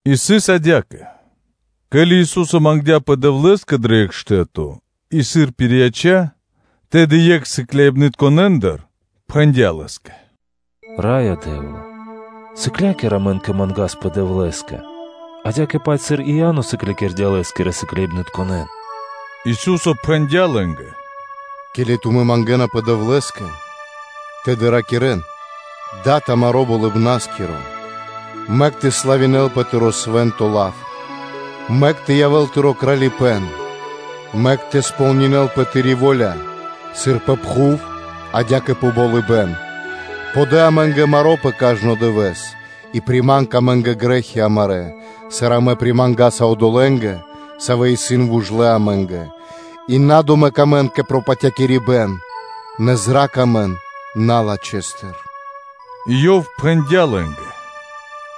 И сыс адя́кэ: ке́ли Ису́со мангдя́пэ Дэвлэ́скэ дро екх штэ́то и, сыр пирияця́, тэды екх сыкляибнытконэндыр пхэндя́ Лэ́скэ: “Раё Дэ́вла! Сыкля́кир амэн тэ мангаспэ Дэвлэ́скэ адя́кэ-паць, сыр и Иа́но сыклякирдя́ лэ́скирэ сыкляибнытконэ́н.” Ису́со пхэндя́ лэ́нгэ: “Ке́ли тумэ́ мангэ́напэ Дэвлэ́скэ, тэды ракирэ́н: ‘Дад амаро́ Болыбна́скиро! Мэк тэ славинэлпэ Тыро́ свэ́нто лав; Мэк тэ явэ́л Тыро́ Кралипэ́н, Мэк тэ сполнинэ́лпэ, Тыри́ во́ля сыр пэ пхув, адя́кэ пэ болыбэ́н; Подэ амэ́нгэ маро́ пэ кажно дывэ́с; И приманг амэ́нгэ грэ́хи амарэ́, Сыр амэ примангаса одолэ́нгэ, Савэ исын вужлэ амэ́нгэ; И на домэк амэн кэ пропатякирибэн; Нэ зра́кх амэн налачхэстыр’” И Ёв пхэндя́ лэ́нгэ: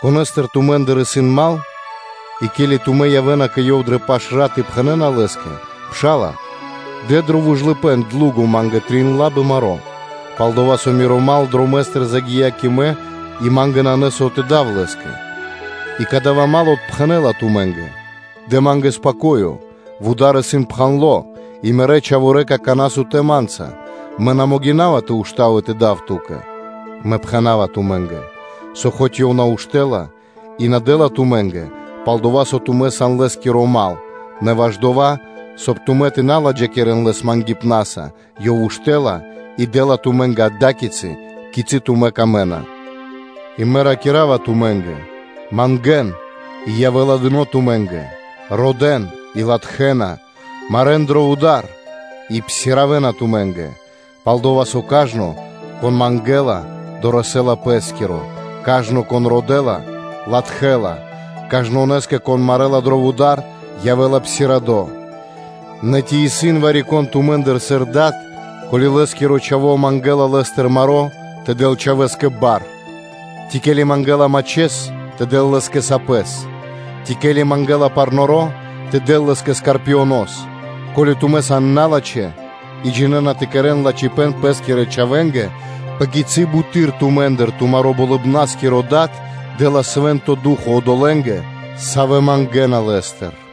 “Конэ́стэ тумэ́ндыр исын дру́го (мал), и ке́ли тумэ́ явэ́на кэ ёв дрэ пашрат и пхэнэ́на лэ́скэ: ‘Пша́ла, дэ дро вужлыпэ́н (длуго) ма́нгэ трин лабы маро́, пал-дова́ со миро мал дромэ́стыр загия́ кэ мэ и ма́нгэ нанэ со тэ дав лэ́скэ; и кадава́ мал отпхэнэ́ла тумэ́нгэ: ‘Дэ ма́нгэ тэ откхинёвав! Вуда́р исын пхандло и мирэ́ чхаворэ́ исын какана́ сутэ́ ма́нца; мэ на могина́ва тэ уштав и тэ псиравав (тэ отпхандав) ту́кэ?’” Мэ пхэна́ва тумэ́нгэ, со мэк (хоць) ёв на уштэ́ла и на дэ́ла тумэ́нгэ, пал-дова́ со тумэ́ сан лэ́скиро мал, нэ ваш дова́, соб (кай) тумэ́ тэ на ладжакирэн лэс мангипнаса, ёв уштэ́ла и дэ́ла тумэ́нгэ ада́кицы, кицы́ тумэ́ камэ́на. И Мэ ракира́ва тумэ́нгэ: мангэ́н, и явэ́ла дыно́ тумэ́нгэ; родэ́н, и латхэ́на; марэ́н дро вуда́р, и псиравэна тумэ́нгэ. Пал-дова́ со кажно, кон мангэ́ла, дорэсэ́ла пэ́скиро; кажно, кон родэ́ла, латхэ́ла; кажнонэ́скэ, кон марэла дро вуда́р, явэ́ла псирадо. Нэ, ци исын вари-кон тумэ́ндыр сыр дад, со, ко́ли лэ́скиро чхаво́ мангэ́ла лэ́стыр маро́, тэ дэл чхавэ́скэ бар? Ци, ке́ли мангэ́ла мачхэс, тэ дэл лэ́скэ сапэс? Ци, ке́ли мангэ́ла парноро, тэ дэл лэ́скэ скорпионос? Ко́ли тумэ́ сан налачхэ́ и джинэ́на тэ кэрэ́н лачхипэ́н пэ́скирэ чхавэ́нгэ, пэ кицы́ буты́р тумэ́ндыр тумаро́ Болыбна́скиро Дад дэ́ла Свэ́нто Ду́хо (Фа́но) одолэ́нгэ, савэ́ мангэна Лэ́стыр!”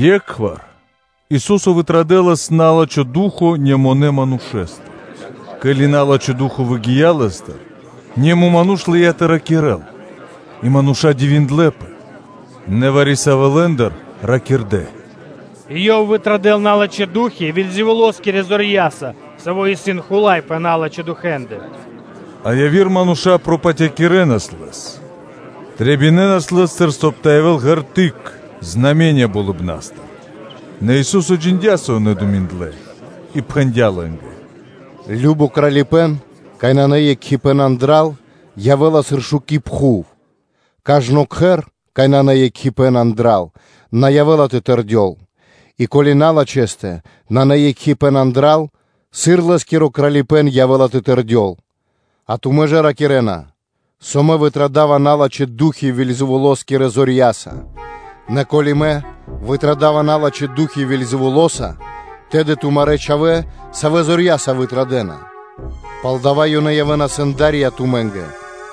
Екхвар Ису́со вытрадэлас на́лачхо ду́хо (фа́но) немонэ (муто) манушэ́стыр. Ке́ли на́лачхо ду́хо (фа́но) выгия́ лэ́стыр, немо ману́ш лыя́ тэ ракирэ́л. И мануша́ дивиндлэ́пэ. Нэ вари-савэ́ лэ́ндыр ракирдэ́: “Ёв вытрадэла налачхэ́ ду́хи (фаны) Вельзэвулоскирэ зорья́са, саво́ исын хула́й пэ налачхэ́ ду́хи.” А яви́р мануша́ пропатякирэнас Лэс, трэбинэнас Лэ́стыр, соб (кай) тэ явэ́л ґерты́к (знаме́ниё) болыбна́стыр. Нэ Ису́со джиндя́, со ёнэ думиндлэ и пхэндя́ лэ́нгэ: “Кажно Кралипэ́н, кай нанэ екхипэ́н андра́л, явэ́ла сыр шуки́ пхув; кажно кхэр, кай нанэ екхипэ́н андра́л, на явэ́ла тэ тэрдёл; и ко́ли налачхэстэ нанэ екхипэ́н андра́л, сыр лэ́скиро кралипэ́н явэ́ла тэ тэрдёл? А тумэ́ ж ракирэ́на, со Мэ вытрадава налачхэ́ ду́хи Вельзэвулоскирэ зорья́са. Нэ ко́ли Мэ вытрадава налачхэ́ ду́хи Вельзэвулоса, тэды тумарэ́ чхавэ́, савэ́ зорья́са вытрадэна? Палдава́ ёнэ явэ́на сэнда́рья тумэ́нгэ,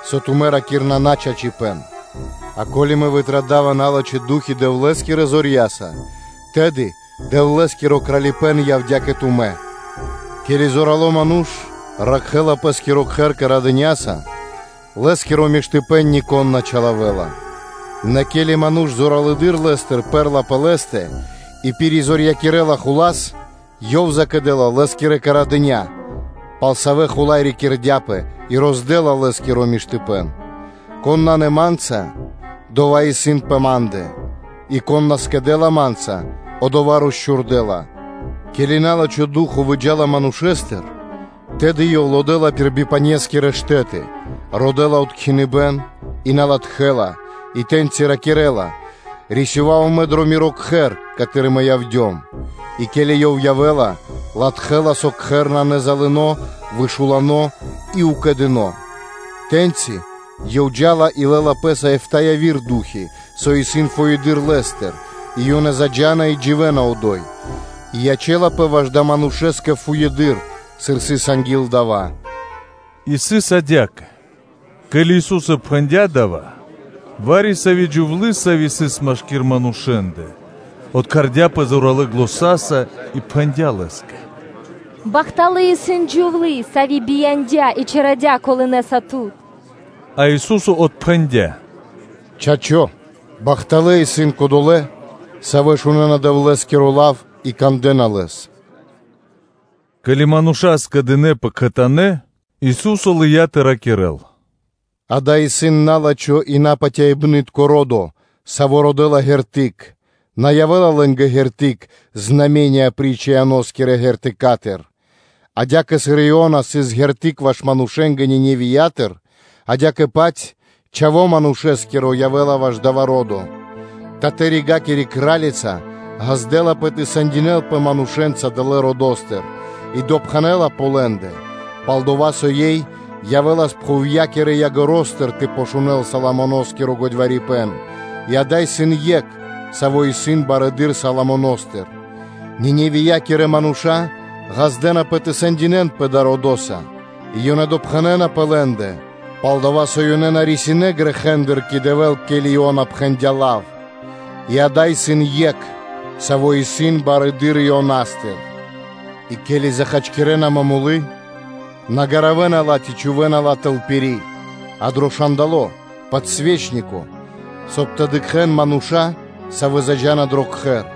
со тумэ́ ракирэ́на начачипэ́н. А ко́ли Мэ вытрадава налачхэ́ ду́хи Дэвлэ́скирэ зорья́са, тэды Дэвлэ́скиро Кралипэ́н явдя́ кэ тумэ́. Ке́ли зорало́ ману́ш ракхэ́ла пэ́скиро кхэр карэдыняса, лэ́скиро миштыпэ́н нико́н на чилавэ́ла; нэ ке́ли ману́ш зоралэды́р лэ́стыр пэрэ́ла пэ лэ́стэ, и пиризорьякирэла хула́с, ёв закэдэла саро́ лэ́скиро марды́тко (оружыё), пал савэ́ хула́й рикирдяпэ, и роздэла лэ́скиро чордо миштыпэ́н. Кон исын на Ма́нца, одова́ исын проти Ма́ндэ, и кон на скэдэ́ла Ма́нца, одова́ росчхурдэла. Ке́ли на́лачхо ду́хо (фа́но) выджа́ла манушэ́стыр, тэды ёв лодэла пир бипанескирэ штэ́ты, родэ́ла откхиныбэн и на латхэ́ла, и тэ́ньчи раки́рла: ‘Рисевава мэ дро миро кхэр, каты́р мэ явдём.’ И ке́ли ёв явэ́ла, латхэ́ла, со кхэр нанэ залыно, вышуладо и укэдыно; тэ́ньчи ёв джа́ла и лэ́ла пэ́са эфта́ (битринэ́нгиро дэш) яви́р ду́хи, со исын фуеды́р лэ́стыр, и ёнэ заджа́на и дживэ́на одо́й; и ячэ́лапэ ваш далэ́ манушэ́скэ фуеды́р, сыр сыс анги́л дава́.” И сыс адя́кэ: ке́ли Ису́со пхэндя́ дава́, вари-сави́ джувлы́, сави́ сыс машки́р манушэ́ндэ, откхардяпэ зоралэ́ заня́са и пхэндя́ Лэ́скэ: “Бахталы́ исын джувлы́, сави́ бияндя́ и чарадя колынэса Тут.” А Ису́со отпхэндя́: “Чачо́, бахталэ́ исын кодолэ́, савэ́ шунэ́на Дэвлэ́скиро лав и кандэ́на лэс.” Ке́ли мануша́ скэдынэ́пэ кхэтанэ́, Ису́со лыя́ тэ ракирэ́л: “Ѓа́да, исын на́лачхо и напатяибнытко ро́до, саво́ родэ́ла ґерты́к (знаме́ниё); на явэ́ла лэ́нгэ ґерты́к апри́ч Ионаскири ґерты́к. Адя́кэ, сыр Иона сыс ґерты́к ваш манушэ́нгэ Ниневиятыр, адя́кэ-паць Чхаво́ Манушэ́скиро явэ́ла ваш дава́ ро́до. Паш-Дывэсэскири (Татэ-Ригакири) Кра́лица ґаздэ́лапэ тэ сэндинэлпэ манушэ́нца далэ́ родо́стыр и допхэнэ́ла пэ лэ́ндэ: пал-дова́ со ёй явэ́лас пхувья́кирэ ягоро́стыр (краёстыр) тэ шунэ́л Соломоно́скиро годьварипэн; и ада́й исын Екх, Саво́ исын барэды́р Соломоностыр. Ниневиякирэ мануша́ ґаздэ́напэ тэ сэндинэнпэ далэ́ родоса и ёнэ допхэнэна пэ лэ́ндэ, пал-дова́ со ёнэ на рисинэ́ грэхэ́ндыр кэ Дэвэ́л, ке́ли Иона пхэндя́ лав; и ада́й исын Екх, Саво́ исын барэды́р Ионастыр. И ке́ли захачкирэна момолы, на гаравэна ла ци чхувэ́на ла тэл пири́, а дро шандало (подсвечнико), соб (кай) тэ дыкхэ́н мануша́, савэ́ джа́на андрэ́ дро кхэр.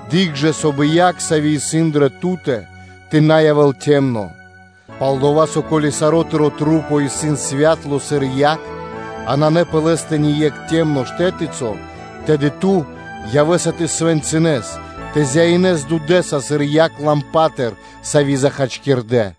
Дыкх жа, соб (кай) дуд (свэ́то), саво́ исын дрэ ту́тэ, тэ на явэ́л цямло. Пал-дова́ со, ко́ли сарэ́ тырэ́ маса́ исын святла сыр яг, а нанэ пэ лэ́стэ ни екх цямло штэтыцо, тэды ту явэ́са тэ зяинэс дудэса сыр момолытконэстыр (светильникостыр), саво́ захачкирдо.”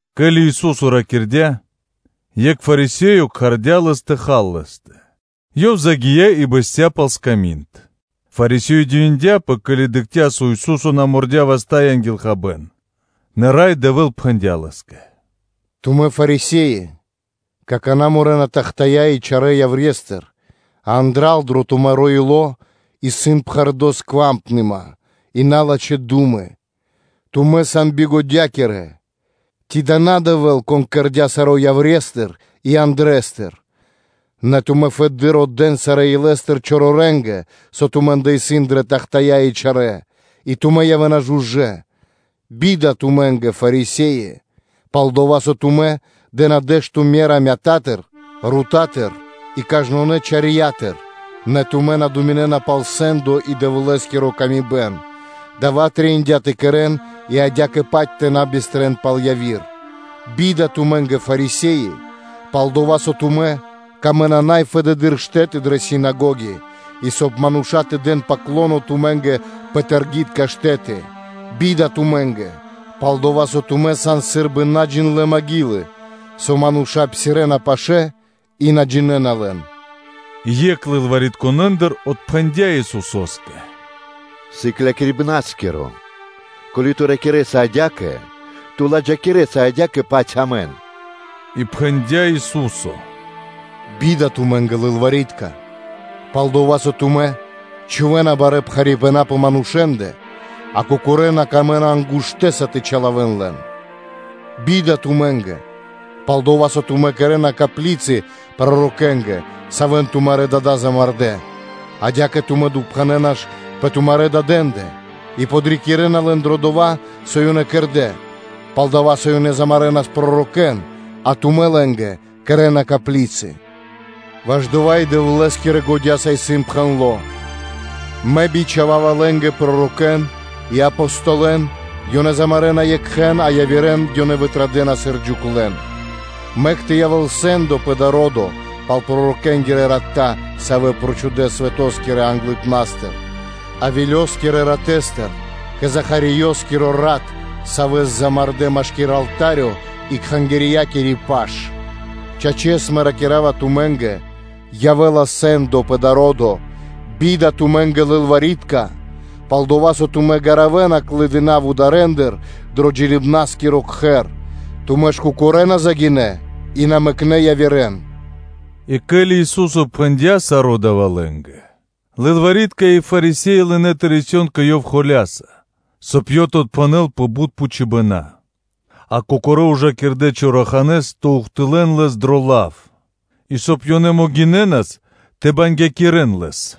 Ке́ли Ису́со ракирдя́, екх Фарисеё кхардя́ Лэс кэ хал лэ́стэ; Ёв загия́ и бэсця́ пал сками́нд. Фарисе́и дивиндэпэ, ке́ли дыкхнэ́, со Ису́со на мордя васта́ анги́л хабэ́н. Нэ Рай Дэвэ́л пхэндя́ Лэ́скэ: “Тумэ́, Фарисе́и, какана́ морэна тахтая́ (чашы) и чарэ́ яврестыр, а андра́л, дро тумаро́ ило́ исын пхэрдо́ бокх кэ чу́жо миштыпэ́н и налачхэ́ ду́мы. Тумэ́ сан бигодякирэ! Ци да на Дэвэ́л, Кон кэрдя́ дава́ саро́ яврестыр и андрэстыр. Нэ тумэ́ фэды́р отдэ́н дыибэ́н илэ́стыр долэ́стыр, со тумэ́ндэ исын дрэ тахтая́, и тумэ́ явэ́на жужэ́. Бида тумэ́нгэ, Фарисе́и; пал-дова́ со тумэ́ дэ́на дэ́што ме́ра мятатыр, рутатыр и кажнонэ́ чарьятыр, нэ тумэ́ на думинэ́на пал сэ́ндо и Дэвлэ́скири ла́ска; дава́ трэиндя́ тэ кэрэ́н и адя́кэ-паць тэ на бистрэн пал яви́р. Бида тумэ́нгэ, Фарисе́и: пал-дова́ со тумэ́ камэ́на най фэдэды́р штэ́ты дрэ синагоги и, соб (кай) мануша́ тэ дэн ‘паклоно’ тумэ́нгэ пэ таргитка штэ́ты. Бида тумэ́нгэ: пал-дова́ со тумэ́ сан сы́рбы надыцьлэ маґилы, со мануша́ псирэ́на пир лэ́ндэ и на джинэ́на лэн.” И екх лылваритконэндыр отпхэндя́ Исусо́скэ: “Сыклякирибнарискиро! Ко́ли Ту ракирэ́са адя́кэ, Ту ладжакирэса адя́кэ-паць амэн!” И пхэндя́ Ису́со: “Бида тумэ́нгэ, лылвари́тка: пал-дова́ со тумэ́ чхувэ́на барэ́ пхарипэна дро джиибэ́н пэ манушэ́ндэ, а кокорэ́ на камэ́на ангуштэса тэ чилавэн лэн. Бида тумэ́нгэ; пал-дова́ со тумэ́ кэрэ́на коплицы пророкэнгэ, савэ́н тумарэ́ дада́ замардэ́. Адя́кэ тумэ́ допхэнэна ж пэ тумарэ́ дадэндэ, и подрикирэна лэн дро дова́, со ёнэ кэрдэ́; пал дава́, со ёнэ замарэнас пророкэ́н, а тумэ́ лэ́нгэ кэрэ́на коплицы. Ваш дава́ и Дэвлэ́скирэ годя́са исын пхэндло́: ‘Мэ бичхава́ва лэ́нгэ пророкэ́н и Апостолэн; ёнэ замарэна екхэн, а явирэ́н ёнэ вытрадэна сыр джуклэн’, мэк тэ явэ́л сэ́ндо пэ дава́ ро́до пал пророкэ́нгирэ рата, савэ́ прочхудэ свэто́скирэ англыпна́стыр Авелёскирэ ратэстыр кэ Захариёскиро рат, савэ́с замардэ́ машки́р алта́рё и Кхангирья́кири паш; чачэс, Мэ, ракира́ва тумэ́нгэ: явэ́ла пхучно, сыр трэй далэ́ родо́стыр. Бида тумэ́нгэ, лылвари́тка: пал-дова́ со тумэ́ гаравэна клыдына вударэндыр дро джиныбнаскиро кхэр; тумэ́ ж кокорэ́ на загинэ́ и на мэкнэ́ явирэ́н.” И ке́ли Ису́со пхэндя́ саро́ дава́ лэ́нгэ, лылвари́тка и Фарисе́и лынэ́ тэ рэсэн кэ Ёв холя́са, соб (кай) Ёв тэ отпхэнэл пэ бут пхучыбэна; а кокорэ́ ужакирдэ чораханэ́с тэ ухтылэ́н Лэс дро лав, и соб (кай) ёнэ могинэ́нас тэ бангякирэн Лэс.